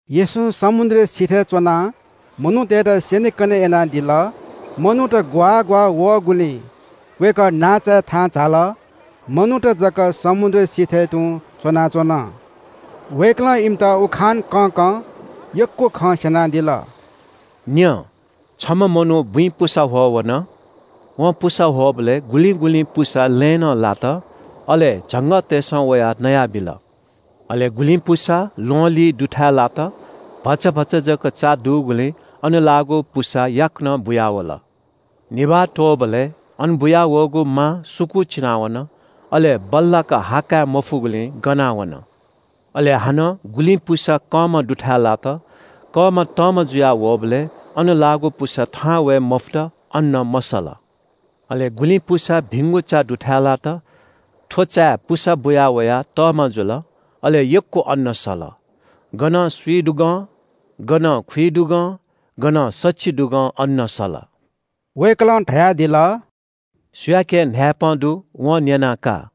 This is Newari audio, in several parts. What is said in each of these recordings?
येशूं समुद्र सिथय् च्‍वनाः मनूतय्‌त स्‍यनेकने यानादिल। मनूत ग्‍वाः ग्‍वाः वःगुलिं वय्‌कः नांचाय् थाहां झाल, मनूत जक समुद्र सिथय् तुं च्‍वनाच्‍वन। वय्‌कलं इमित उखान कँकं यक्‍व खँ स्‍यनादिल – “न्‍यँ, छम्‍ह मनू बुँइ पुसा ह्वः वन। वं पुसा ह्वःबलय् गुलिं गुलिं पुसा लँय् नं लात, अले झंगःतय्‌सं वयाः नयाबिल। अले गुलिं पुसा ल्‍वहंलिं दुथाय् लात। भचा भचा जक चा दुगुलिं अन लाःगु पुसा याकनं बुयावल। निभाः त्‍वःबलय् अन बुयावःगु मा सुकूचिना वन, अले बल्‍लाक हा काय् मफुगुलिं गना वन। अले हानं गुलिं पुसा कंमा दुथाय् लात। कंमा तःमा जुया वःबलय् अन लाःगु पुसा थाहां वये मफुत, अन्‍न मसल। अले गुलिं पुसा भिंगु चा दुथाय् लात। थ्‍व चाय् पुसा बुया वयाः तःमा जुल। अले यक्‍व अन्‍न सल। गनं स्‍विदुगं, गनं खुइदुगं, गनं सछिदुगं अन्‍न सल।” वय्‌कलं धयादिल – “सुयाके न्‍हाय्‌पं दु, वं न्‍यना का।”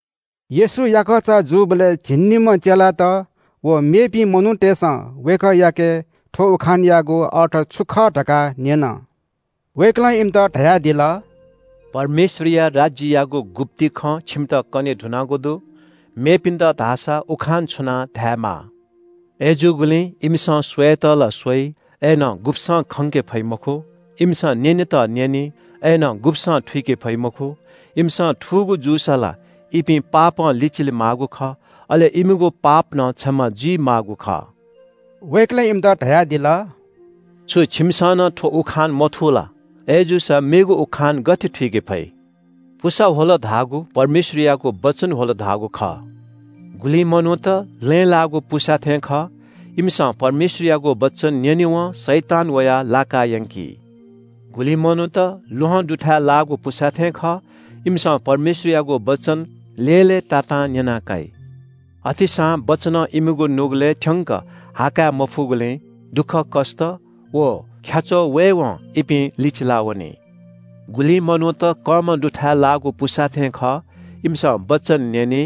येशू याकःचा जूबलय् झिंनिम्‍ह चेलात व मेपिं मनूतय्‌सं वय्‌कःयाके थ्‍व उखानयागु अर्थ छु खः धकाः न्‍यन। वय्‌कलं इमित धयादिल – “परमेश्‍वरया राज्‍ययागु गुप्‍ति खँ छिमित कने धुनागु दु, मेपिन्‍त धाःसा उखान छुनाः धायेमाः। “‘अय्‌जूगुलिं इमिसं स्‍वयेत ला स्‍वइ, अय्‌नं गुब्‍सं खंके फइ मखु। इमिसं न्‍यनेत न्‍यनी, अय्‌नं गुब्‍सं थुइके फइ मखु। इमिसं थूगु जूसा ला इपिं पापं लिचिले माःगु खः, अले इमिगु पाप नं क्षमा जुइमाःगु खः।’” वय्‌कलं इमित धयादिल – “छु छिमिसं नं थ्‍व उखान मथू ला? अय्‌जूसा मेगु उखान गथे थुइके फइ? पुसा ह्वल धाःगु परमेश्‍वरयागु वचन ह्वल धाःगु खः। गुलिं मनूत लँय् लाःगु पुसा थें खः। इमिसं परमेश्‍वरयागु वचन न्‍यनेवं शैतान वयाः लाकायंकी। गुलिं मनूत ल्‍वहं दुथाय् लाःगु पुसा थें खः। इमिसं परमेश्‍वरयागु वचन लय्‌लय्‌तातां न्‍यना काइ। अथेसां वचनं इमिगु नुगलय् थ्‍यंक हा काय् मफइगुलिं दुःखकष्‍ट व ख्‍याच्‍वः वयेवं इपिं लिचिला वनी। गुलिं मनूत कंमा दुथाय् लाःगु पुसा थें खः। इमिसं वचन न्‍यनी।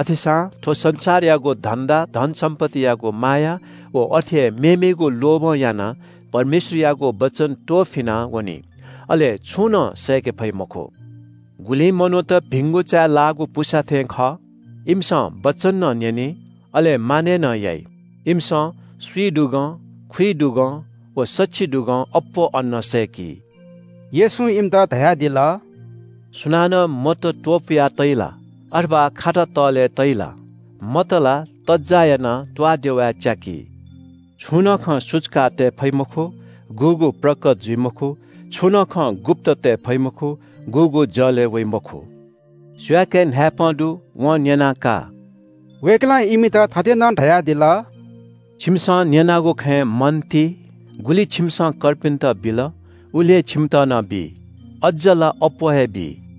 अथेसां थ्‍व संसारयागु धन्‍दा, धन सम्‍पत्तियागु माया व अथे हे मेमेगु लोभं यानाः परमेश्‍वरयागु वचन त्‍वःफिना वनी, अले छंु नं सय्‌के फइ मखु। गुलिं मनूत भिंगु चाय् लाःगु पुसा थें खः। इमिसं वचन नं न्‍यनी, अले मानय् नं याइ। इमिसं स्‍विदुगं, खुइदुगं, व सछिदुगं अप्‍वः अन्‍न सय्‌की।” येशूं इमित धयादिल – “सुनानं मत त्‍वपुया तइ ला? अथवा खाता तःले तइ ला? मत ला तज्‍जाः यानाः त्‍वाःदेवाय् च्‍याकी। छुं नं खँ सुचुकां तये फइ मखु, गुगु प्रकत जुइ मखु, छुं नं खँ गुप्‍त तये फइ मखु, गुगु जलय् वइ मखु। सुयाके न्‍हाय्‌पं दु, वं न्‍यना का।” वय्‌कलं इमित थथे नं धयादिल – “छिमिसं न्‍यनागु खँय् मन ति। गुलि छिमिसं कर्पिन्‍त बिल, उलि हे छिमित नं बी। अज्‍ज ला अप्‍वः हे बी,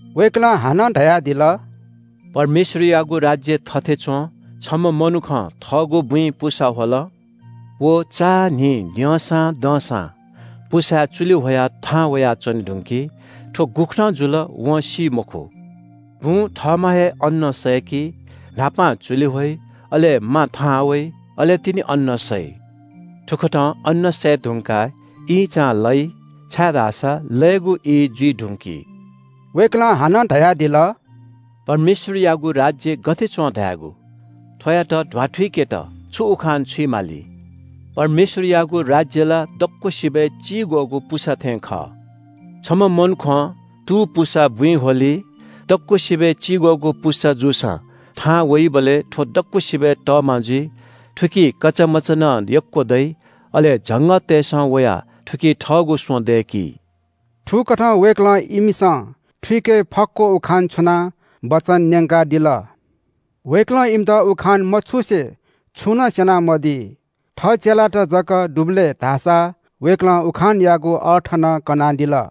वय्‌कलं हानं धयादिल – “परमेश्‍वरयागु राज्‍य थथे च्‍वं। छम्‍ह मनुखं थःगु बुँइ पुसा ह्वल। व चान्‍हि द्यंसां दंसां पुसाय् चुलि ह्वयाः थाहां वयाच्‍वने धुंकी। थ्‍व गुकथं जुल वं सी मखु। बुँ थःम्‍हं हे अन्‍न सय्‌की। न्‍हापां चुलि ह्वइ, अले मा थाहां वइ, अले तिनि अन्‍न सइ। थुकथं अन्‍न सये धुंकाः ईंचां लइ, छाय्‌धाःसा लयेगु ई जुइ धुंकी।” वय्‌कलं हानं धयादिल – “परमेश्‍वरयागु राज्‍य गथे च्‍वं धायेगु? थ्‍वयात ध्‍वाथुइकेत छु उखान छुइमाली? परमेश्‍वरयागु राज्‍य ला दक्‍वसिबय् चिग्‍वःगु पुसा थें खः। छम्‍ह मनुखं तू पुसा बुँइ ह्वली। दक्‍वसिबय् चिग्‍वःगु पुसा जूसां थाहां वइबलय् थ्‍व दक्‍वसिबय् तःमा जुइ। थुकी कचामचा नं यक्‍व दइ, अले झंगःतय्‌सं वयाः थुकी थःगु स्‍वँ दय्‌की।” थुकथं वय्‌कलं इमिसं थुइके फक्‍व उखान छुनाः वचन न्‍यंकादिल। वय्‌कलं इमित उखान मछुसे छुं नं स्‍यनामदी। थः चेलात जक दुबलय् धाःसा वय्‌कलं उखानयागु अर्थ नं कनादिल।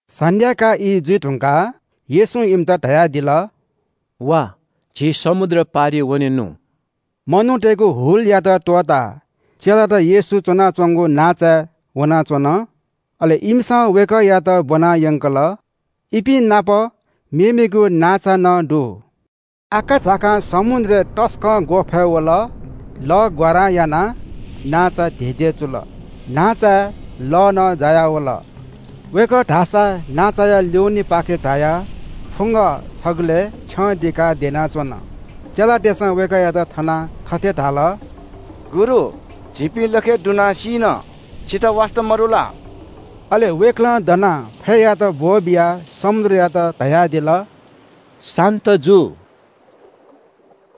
सन्‍ध्‍याकाः ई जुइ धुंकाः येशूं इमित धयादिल – “वा, झी समुद्र पारिइ वनेनु।” मनूतय्‌गु हुलयात त्‍वःताः चेलात येशू च्‍वनाच्‍वंगु नांचाय् वनाः च्‍वन। अले इमिसं वय्‌कःयात ब्‍वनायंकल। इपिं नाप मेमेगु नांचा नं दु। आकाझाकां समुद्रय् तसकं ग्‍वःफय् वल। लः ग्‍वारां यानाः नांचा धेधेचुल। नांचाय् लः नं जायावल। वय्‌कः धाःसा नांचाया ल्‍युनेपाखे झायाः फुंग छगलय् छ्यं दिकाः द्यनाच्‍वन। चेलातय्‌सं वय्‌कःयात थनाः थथे धाल – “गुरु, झीपिं लखय् दुनाः सीन, छितः वास्‍ता मदु ला?” अले वय्‌कलं दनाः फय्‌यात ब्‍वःबियाः समुद्रयात धयादिल – “शान्‍त जु।”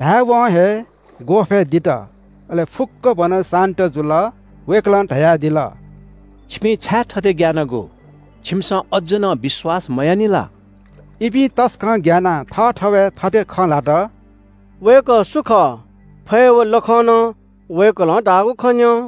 धाय्‌वं हे ग्‍वःफय् दित, अले फुक्‍कभनं शान्‍त जुल। वय्‌कलं धयादिल – “छिपिं छाय् थथे ग्‍यानागु? छिमिसं अज्‍ज नं विश्‍वास मयानानि ला?” इपिं तसकं ग्‍यानाः थःथवय् थथे खँ ल्‍हात – “वय्‌कः सु खः? फय् व लखं नं वय्‌कलं धाःगु खँ न्‍यं।”